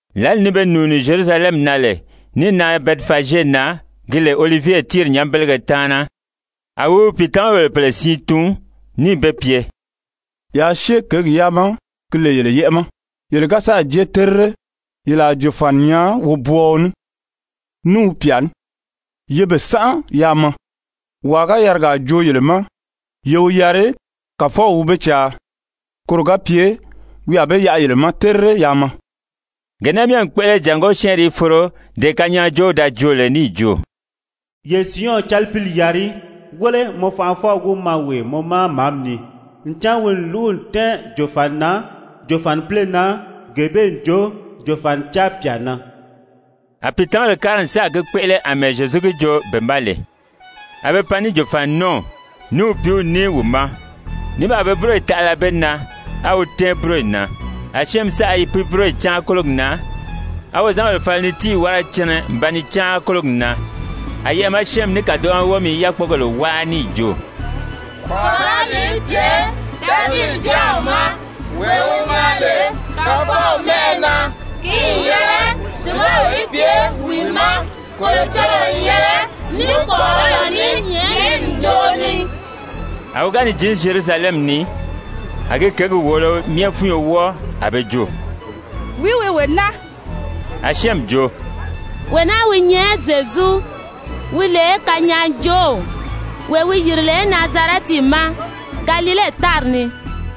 Lǎli ni be nùuni Zyerusalɛmi na lè níì nan Bɛtifazye na gi lè Olivye tíiri nyanbelege taana, a wi wi pìitamabèle pèle siin tun, níì be pye: «Yaa syée kěgi yaa ma, ki lè yele yɛ́ʔɛ ma. Yele ga jée terire yele a jòfani nyaa wobwɔɔɔ ní, ní wi pyà ní. Ye be sánʔa yaa maa. Wàa ga yarigaa joo yele ma, ye wi yari: Kàfɔw wi be caa, koro ga pye wi a be yaʔa yele ma terire yaa maa.» Gee naa myɛ n kpéʔele jàngó syɛ́ɛnri í foro dee kanyaajoow da joo lè níì jo: «Ye Siyɔn calipili yari, ‹wéle, mɔ fanʔafɔw wi maa wee mɔ ma màámi ni. Ncan wi n lúgu n tɛ́ɛn jòfani na, jòfanipile na, gee bee n jo, jòfanicaa pyà na.›» A pìitamabèle kári n sáà gi kpéʔele àmɛɛ Zyezu gi joo be ma lè. A be pan ní jòfaninɔɔw, ní wi pìíw ní wi ma, ní baa be búroyi taʔala be na, á wi tɛ́ɛn búroyi na. A syɛ́ɛnmi saʔa i pi búroyi cáan kólogi na, á wozanbèle fala ni tíiyi wára cɛnɛ n ba ni cáan kólogi na. A yɛʔɛ̀ ma syɛ́ɛnmi ní kàdoʔo ma wómi i yákpogèle wáa níì jo: «Kpɔ̀ʔɔrɔli í pye Davidi Jáaw ma. Wee wi maa lè Kàfɔw mɛ́ʔɛ na, ki n yɛlɛ dùbaw í pye wi ma. Kolocɔlɔɔ n yɛlɛ ní kpɔ̀ʔɔrɔlɔ ní nyɛ̀ʔɛni ǹjoʔo ni.» A wi ga ni jǐn Zyerusalɛmi ni, a gi kěgi wòolo myɛ fúnyo wɔ́ɔ. A be jo: «Wìí wi wee naa?» A syɛ́ɛnmi jo: «Wee naa wi nyɛ Zyezu, wi lè kanyaajoow, wee wi yìri lè Nazarɛti ma, Galile tári ni.»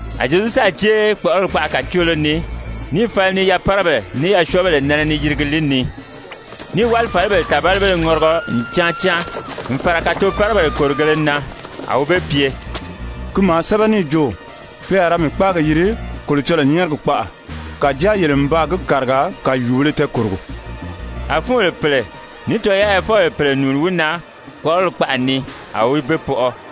A Zyezu sáà jée kpɔ̀ʔɔrɔli kpaʔa kàcoolo ni níì fala ni yapárabèle ní yasyɔɔbèle myɛ nɛnɛ ni yirigi li ni. Níì wálifalibèle tàbalibéle ŋɔrigɔ n cáan cáan n fàra kàtopárabèle kòrigēle na. A wi be pye: «Ki maa sɛ́bɛ níì jo: ‹Pe a ra mii kpáagi yiri Kolocɔlɔɔ nyɛ́ɛrigi kpaʔa,› kàjáa yele n baa gi kàriga kàyuubēle tɛɛkòrogo.» A fúunbèle pèle ní tɔyaayafɔbèle pèle nùuni wi na kpɔ̀ʔɔrɔli kpaʔa ni, a wi be pɔʔɔ.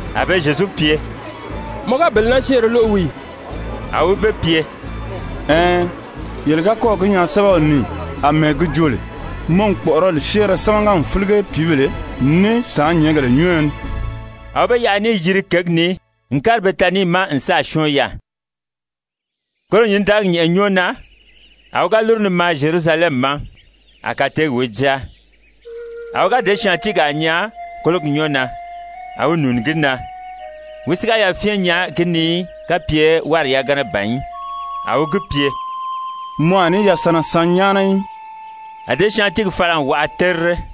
A be Zyezu pye: «Mɔ ga bele naa syɛ́ɛnrɛ lóʔo wii ì?» A wi be pye: «Ɛɛn, yele ga kɔ́ɔ̀ gi nyaa sɛ́bɛw ni ì àmɛɛ gi joo lè: ‹Mɔ n kpɔ̀ʔɔrɔli syɛ́ɛnrɛ sámaga n fílige pìíbèle ní sàánnyɛɛngèle nyɔ́ɔyɔ ni?›» A wi be yaʔa níì yiri kěgi ni n kári Betanii ma n sáà syɔ́ɔn yaà. Koro nyǐndaligi nyɛ̀ʔɛ nyɔ́ɔ na, a wi ga lúru ni maa Zyerusalɛmi ma, a kateegi wi jáa. A wi ga děsyaantiigaa nyaa kólogi nyɔ́ɔ na, a wi nùuni gi na. Wi si ga yafyɛn nyaa gi ni í kapye wári yagana ban í. A wi gi pye: «Mɔ a ní yasanna san nyáana í.» A děsyaantiigi fala n waʔa terire.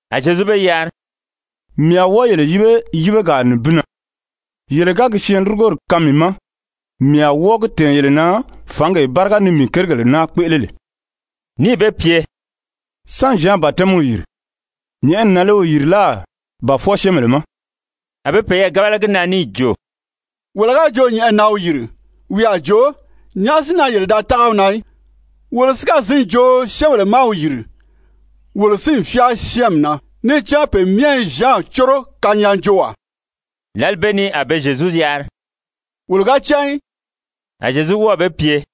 A Zyezu be yari: «Mii a wɔ́ɔ yele yíbe yíbegaa nibin na, yele ga gi syɛɛnlurugori kaan mii ma, mii a wɔ́ɔ gi tɛ̀ɛn yele na fǎngee báriga ni mii kérigèle naa kpéʔele lè,» níì be pye: «Sán Zyan batɛmiw yìri? Nyɛ̀ʔɛni na lé wi yìri láà ba fwɔɔ syɛ́ɛnbèle ma?» A be peyɛɛ gábala gi na níì jo: «Wolo ga jo nyɛ̀ʔɛni na wi yìri, wi a jo: ‹Nyàʔá si na yele da tága wi na í?› Wolo si ga zǐn jo: ‹Syɛ́ɛnbèle má wi yìri,› wolo si n fyáa syɛ́ɛnmi na, níì cán pe myɛ i Zyan córo kanyaajoowaa.» Lǎli bee ni a be Zyezu yari: «Wolo ga cán í.» A Zyezu wɔ́ɔ̀ be pye: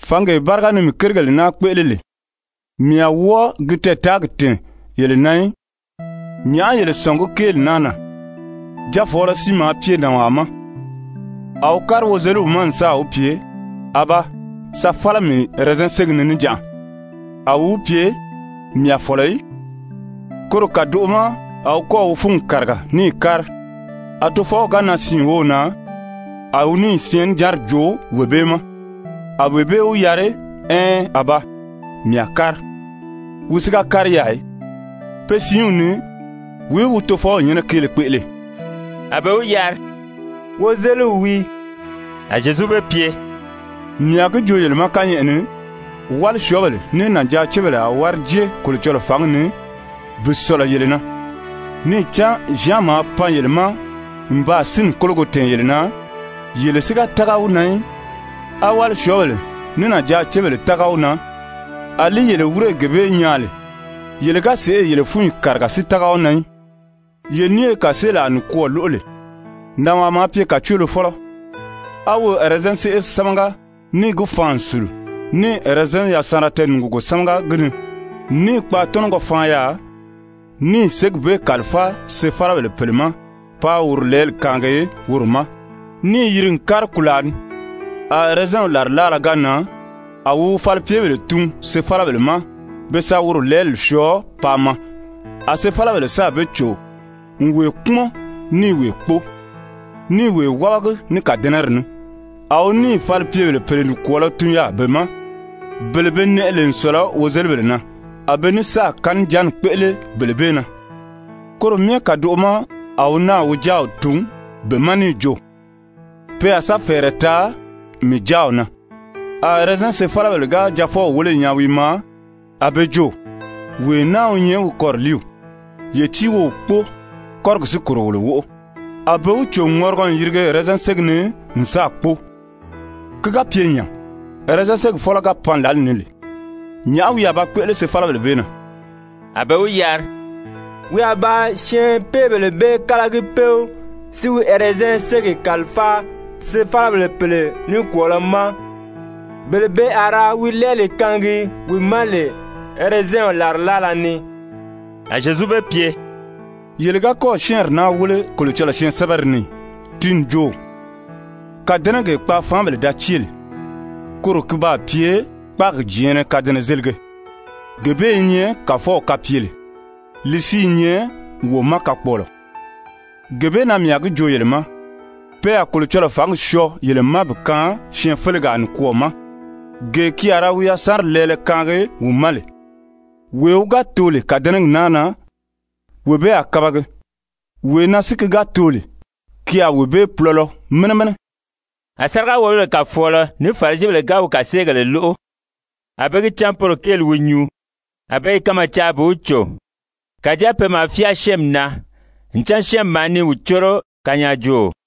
«Fǎngee báriga ni mii kérigèle naa kpéʔele lè, mii a wɔ́ɔ gi tɛɛtaagi tɛ̀ɛn yele na í. «Nyàʔá yele sɔ̀ngí kéeli naa na? Jaafɔɔlɔ siin maa pye nànwaa ma. A wi kári wozeliw ma n sáà wi pye: ‹Abaa, sa fála mii ɛrɛzɛn ségi ni níjanʔa.› A wi wi pye: ‹Mii a fɔ̀lɔ í.› Koro kàdoʔo ma a wi kɔ́ɔ̀ wi fúngi kàriga níì kári. A tofɔw ga nan siin wów na, a wi níì syɛɛnnijanri joo wee bee ma. A wee bee wi yari: ‹Ɛɛn, Abaa, mii a kári.› Wi si ga kári yaà í. Pe siinw ni, wìí wi tofɔw nyɛ́nɛ kéele kpéʔele?» A be wi yari: «Wozeliw wii.» A Zyezu be pye: «Mii a gi joo yele ma kányɛʔɛ ni, wálisyɔɔbèle ní nànjaacebèle a wári jée Kolocɔlɔɔ fǎngi ni bi sɔ̀lɔ yele na. Níì cán Zyan maa pan yele ma n baa sínni kólogo tɛ̀ɛn yele na, yele si ga tága wi na í. A wálisyɔɔbèle ní nànjaacebèle tága wi na, àlí yele wírè gee bee nyaa lè, yele ga sèʔê yele fúnyi kàriga si tága wi na í. «Ye ní ye kàseelaa nikwɔɔ lóʔo lee. Nànwaa maa pye kàcoolofɔlɔ, a wi ɛrɛzɛn séʔe sámaga níì gi faan n sùlu. Níì ɛrɛzɛnw yasanra tɛɛnùgugo sámaga gi ni, níì kpaatɔnɔgɔ faan yaà, níì ségi bee kàlifáa sefalabèle pèle ma páā woro lɛɛli kaangi woro ma. Níì yiri n kári kùlaa ni. A ɛrɛzɛnw làrilaala ga nan a wi wi falipyebèle tun sefalabèle ma be sa woro lɛɛli syɔɔ paa maa. A sefalabèle sáà be cò n wee kpúmɔn níì wee kpóo, níì wee wábagi ní kàdɛnɛri ní. A wi níì falipyebèle pèle nikwɔɔlɔ tun yaà be ma, bele be nɛʔɛ lè n sɔ̀lɔ wozelibèle na. A be ní sáà kanijanni kpéʔele bele bee na. Koro myɛ kàdoʔo ma a wi náà wi jáaw tun be ma níì jo: ‹Pe a sa fɛ̀ɛrɛ taa mii jáaw na.› A ɛrɛzɛn sefalabèle ga jaafɔw wéle n nyaa wi i maa, a be jo: ‹Wee naa wi nyɛ wi kɔriliiw. Ye tíi wo wi kpóo, kɔ́rigi si kòro wolo wóʔo.› A be wi cò n ŋɔrigɔ n yirige ɛrɛzɛn ségi ni n sáà kpóo. Ki ga pye nya, ɛrɛzɛn ségi fɔ́lɔ ga pan lǎli ni lè, nyàʔá wi a ba kpéʔele sefalabèle bee na?» A be wi yari: «Wi a ba syɛɛnpeebèle bee kálagi péw si wi ɛrɛzɛn ségi kàlifáa sefalabèle pèle nikwɔɔlɔ ma, bele be a ra wi lɛɛli kaangi wi ma lè ɛrɛzɛnw làrilaala ni.» A Zyezu be pye: «Yele ga kɔ́ɔ̀ syɛ́ɛnri naa wéle Kolocɔlɔɔ syɛɛnsɛbɛri ni ì? Ti n jo: ‹Kàdɛnɛgee kpaafaanbèle da cée lè, koro ki baa pye kpáagi jɛ̀ɛ́nnɛ kadɛnɛzelige. Gee bee i nyɛ Kàfɔw kapyele, li si i nyɛ wo ma kakpɔɔlɔ.› Gee bee na mii a gi joo yele ma, pe a Kolocɔlɔɔ fǎngi syɔɔ yele ma bi kaan syɛɛnfelegaa nikwɔɔ ma, gee ki a ra wi yasanri lɛɛlɛ kaangi wi ma lè. [ Wee wi ga too lè kàdɛnɛgi naa na, wee bee a kabagi, wee na si ki ga too lè, ki a wee bee pulɔlɔ mɛnɛ mɛnɛ.]» A sáriga-wòlobèle kàfɔɔlɔFarisibèle ga wi kàseegèle lóʔo, a be gi cán poro kéeli wi nyuu. A be i kanmaa caa bi wi cò, kàjáa pe maa fyáa syɛ́ɛnmi na, ncan syɛ́ɛnmi maa ni wi córo kanyaajooo.